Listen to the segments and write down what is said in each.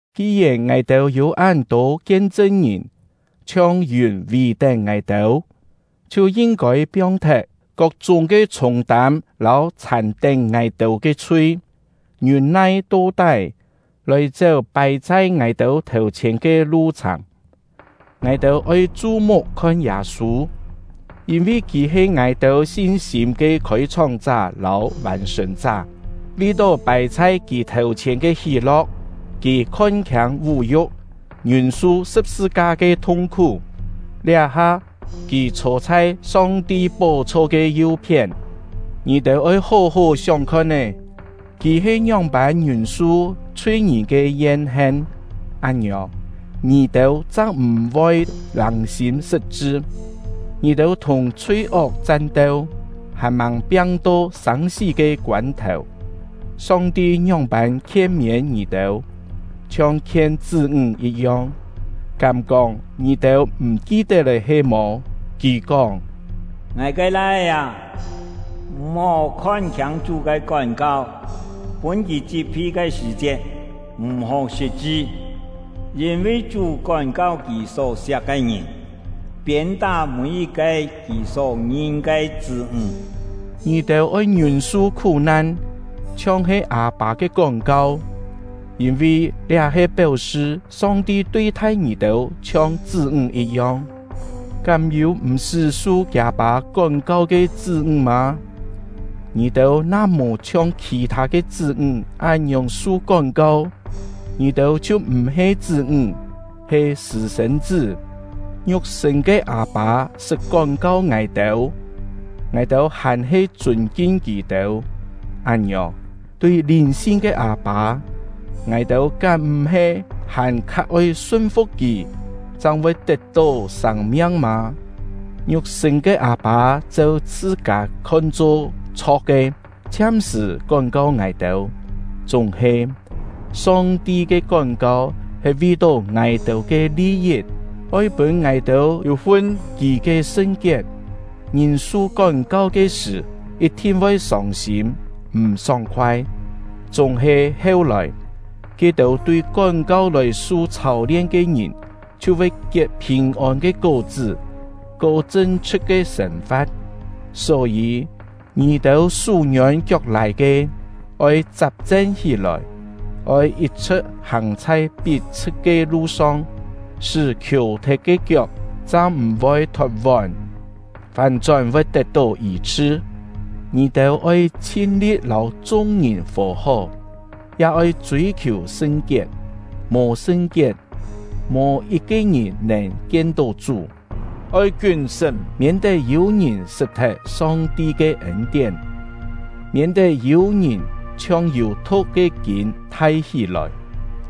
Ki-yèn ngài-têu yû án-tô kien-chṳn-ngìn, chhiong yùn vì-tén ngài-têu, chhiu yin-kôi piong-thet kok-chúng ke chhûng-tâm lâu chhàn-tén ngài-têu ke chhui, ngiûn-nai to-tái lòi chéu pài chhai ngài-têu thèu-chhièn ke lu-chhàng. Ngài-têu oi chu-muk khon Yâ-sû, yîn-vi kì he ngài-têu sin-sîm ke khôi-chhóng-chá lâu vàn-sṳ̀n-chá. Vi-tó pài chhai kì thèu-chhièn ke hí-lo̍k, kì khon-khiâng vú-yu̍k, ngiûn-su sṳ̍p-sṳ-ka ke thung-khú; liá-ha, kì chhô chhai Song-ti pó-chho ke yu-phién. Ngì-têu oi hó-hó sióng khon-é, kì he ngióng-pân ngiûn-su chhui-ngìn ke yen-hen; án-ngiòng, ngì-têu chang m̀-voi lâng-sîm sṳt-chṳ. Ngì-têu thùng chhui-ok chan-teu, hàn-màng piang-to sâng-sí ke koân-thèu. Song-ti ngióng-pân khien-miên ngì-têu, chhiong khien chṳ́-ńg yit-yong, kám-kóng ngì-têu m̀ ki-tet lé he-mò? Kì kóng: Ngài ke lai-é â, m̀-hó khon-khiâng Chú ke kón-kau, pûn Kì chit-phi ke sṳ̀-chiet, m̀-hó sṳt-chṳ; yîn-vi Chú kón-kau Kì só-siak ke ngìn, piên-tá mî-yit-ke Kì só ngin ke chṳ́-ńg. Ngì-têu oi ngiûn-su khú-nan chhiong he â-pâ ke kón-kau, yîn-vi liá he péu-sṳ Song-ti tui-thai ngì-têu chhiong chṳ́-ńg yit-yong. Kám yû m̀-sṳ́ su kiâ-pâ kón-kau ke chṳ́-ńg mâ? Ngì-têu na mò chhiong khì-thâ ke chṳ́-ńg án-ngiòng su kón-kau, ngì-têu chhiu m̀-he chṳ́-ńg, he sṳ̂-sên-chṳ́. Ngiuk-sṳ̂n ke â-pâ sṳt kón-kau ngài-têu, ngài-têu hàn-he chûn-kin kì-têu. Án-ngiòng, tui lìn-sin ke Â-pâ, ngài-têu kám m̀-he hàn-kha oi sun-fu̍k Kì, chang voi tet-tó sâng-miang mâ? Ngiuk-sṳ̂n ke â-pâ cheu chhṳ-kâ khon-cho chho̍k ke, chhiam-sṳ̀ kón-kau ngài-têu; chúng-he, Song-ti ke kón-kau he vi-tó ngài-têu ke li-yit, oi pûn ngài-têu yû-fun Kì ke sṳn-kiet. Ngìn su kón-kau ke sṳ̀, yit-thin voi sông-sîm, m̀ sóng-khoai; chúng-he heu-lòi, ke-têu tui kón-kau lòi su chhâu-lien ke ngìn chhiu voi kiet phìn-ôn ke kó-chṳ́, ko chṳn-chhṳ̍t ke sên-fa̍t. Só-yî, ngì-têu sú-ngiôn kiok-lài ke, oi chap-chen hí-lòi! Oi yit-chhṳ̍t hàng chhai pit-chhṳ̍t ke lu-song, sṳ́ khiò-thet ke kiok chang m̀-voi thot-vón, fán-chón voi tet-tó yî-chhṳ. Ngì-têu oi chhin-li̍t lâu chung-ngìn fò-hó, ya oi chûi-khiù sṳn-kiet; mò sṳn-kiet, mò yit-ke ngìn nèn kien-tó Chú. Oi kiún-sṳ́m! Miên-tet yû-ngìn sṳt-thet Song-ti ke ên-tién; miên-tet yû-ngìn chhiong yû thu̍k ke kîn thai hí-lòi,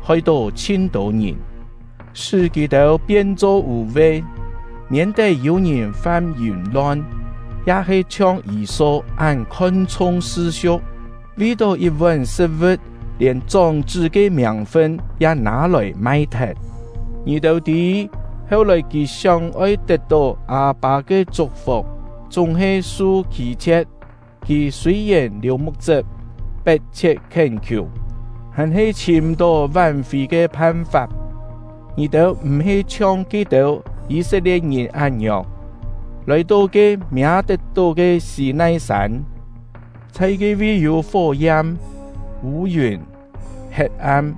hoi-tó chhin-tô ngìn, sṳ́ kì-têu pien-cho vû-ve; miên-tet yû-ngìn fam yìm-lon, ya-he chhiong Yî-so án khon-chhung sṳ-siu̍k, vi-tó yit-vón sṳ̍t-vu̍t lièn chóng-chṳ́ ke miàng-fun ya nâ-lòi mai-thet. Ngì-têu tî, heu-lòi kì sióng-oi tet-tó â-pâ ke chuk-fuk, chúng-he su khî-chhie̍t; kì sûi-yèn liù muk-chṳp, pet-chhiet khién-khiù, hàn-he chhìm m̀-tó ván-fì ke phan-fap. Ngì-têu m̀-he chhiong ke-têu Yî-set-lie̍t-ngìn án-ngiòng, lòi-to ke miâ-tet-tó ke Sî-nai-sân; chhai ke-vi yû fó-yam, vû-yùn, het-am,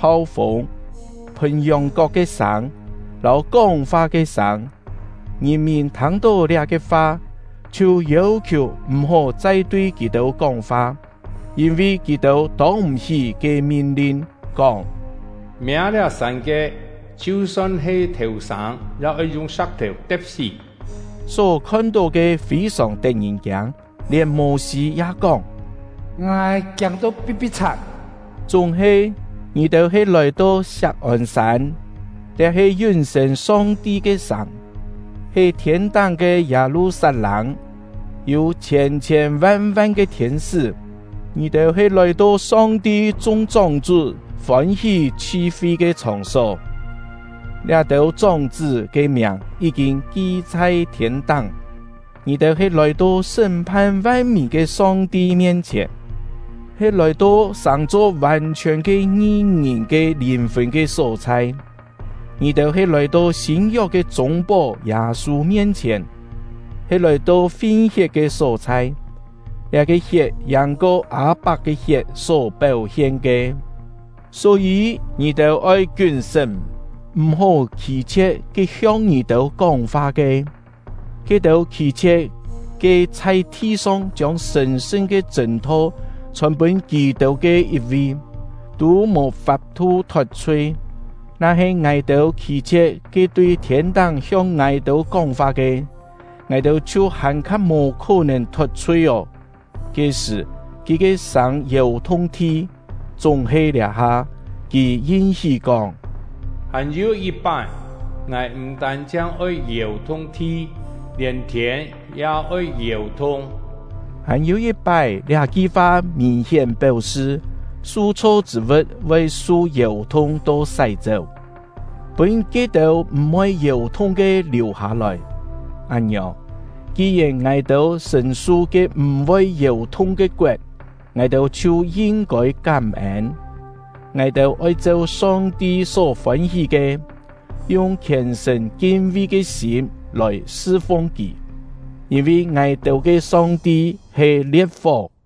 phau-fûng, phùn yòng-kok ke sâng, lâu kóng-fa ke sâng. Ngìn-mìn thâng-tó liá-ke fa, chhiu yêu-khiù m̀-hó chai tui kì-têu kóng-fa; yîn-vi kì-têu tông m̀-hí ke min-lin, kóng: “Miâ liá sân ke, chhiu-son he thèu-sâng ya oi yung sa̍k-thèu te̍p-sí.” Só khon-tó ke fî-sòng tet-ngìn-kiâng, lièn Mô-sî ya kóng: “Ngài kiâng-to pi̍t-pi̍t-chhat!” Chúng-he, ngì-têu he lòi-to Siak-ôn-sân; liá he yún-sên Song-ti ke sàng, he thiên-táng ke Yâ-lu-sat-lâng, yû chhiên-chhiên van-van ke thiên-sṳ́. Ngì-têu he lòi-to Song-ti chung chóng-chṳ́ fôn-hí chhi-fi ke chhòng-só; liá-têu chóng-chṳ́ ke miàng yí-kîn ki chhai thiên-táng. Ngì-têu he lòi-to sṳ́m-phan van-mìn ke Song-ti mien-chhièn, he lòi-to sàng-cho vàn-chhiòn ke ngi-ngìn ke lìn-fùn ke só-chhai. Ngì-têu he lòi-to sîn-yok ke chûng-pó Yâ-sû mien-chhièn, he lòi-to fin-hiet ke só-chhai; liá-ke hiet yàng-ko Â-pak ke hiet só péu-hien ke. Só-yî, ngì-têu oi kiún-sṳ́m, m̀-hó khî-chhie̍t ke hiong ngì-têu kóng-fa ke. Ke-têu khî-chhie̍t ke chhai thi-song chiông sṳ̀n-sṳn ke chṳ̂n-tho chhòn pûn kì-têu ke yit-vi, tû mò fap-thu thot-chhui; na-he ngài-têu khî-chhie̍t ke tui thiên-táng hiong ngài-têu kóng-fa ke, ngài-têu chhiu hàn-kha mò khó-nèn thot-chhui ô! Ke-sṳ̀, Kì ke sâng yèu-thung thi, chúng-he liá-ha, Kì yin-hí kóng: “Hàn-yû yit-pái, Ngài m̀ tân-chhiang oi yèu-thung thi, lièn thiên ya oi yèu-thung.” “Hàn-yû yit-pái” liá-ki fa mìn-hién péu-sṳ su-chho chṳ̂ vu̍t voi su yèu-thung to sái-chéu, pûn ke-têu m̀-voi yèu-thung ke liù-hâ-lòi. Án-ngiòng, ki-yèn ngài-têu sṳ̀n-su ke m̀-voi yèu-thung ke koet, ngài-têu chhiu yin-kôi kám-ên. Ngài-têu oi cheu Song-ti só fôn-hí ke, yung khièn-sṳ̀n kin-vi ke sîm lòi sṳ-fung Kì, yîn-vi ngài-têu ke Song-ti he lie̍t-fó.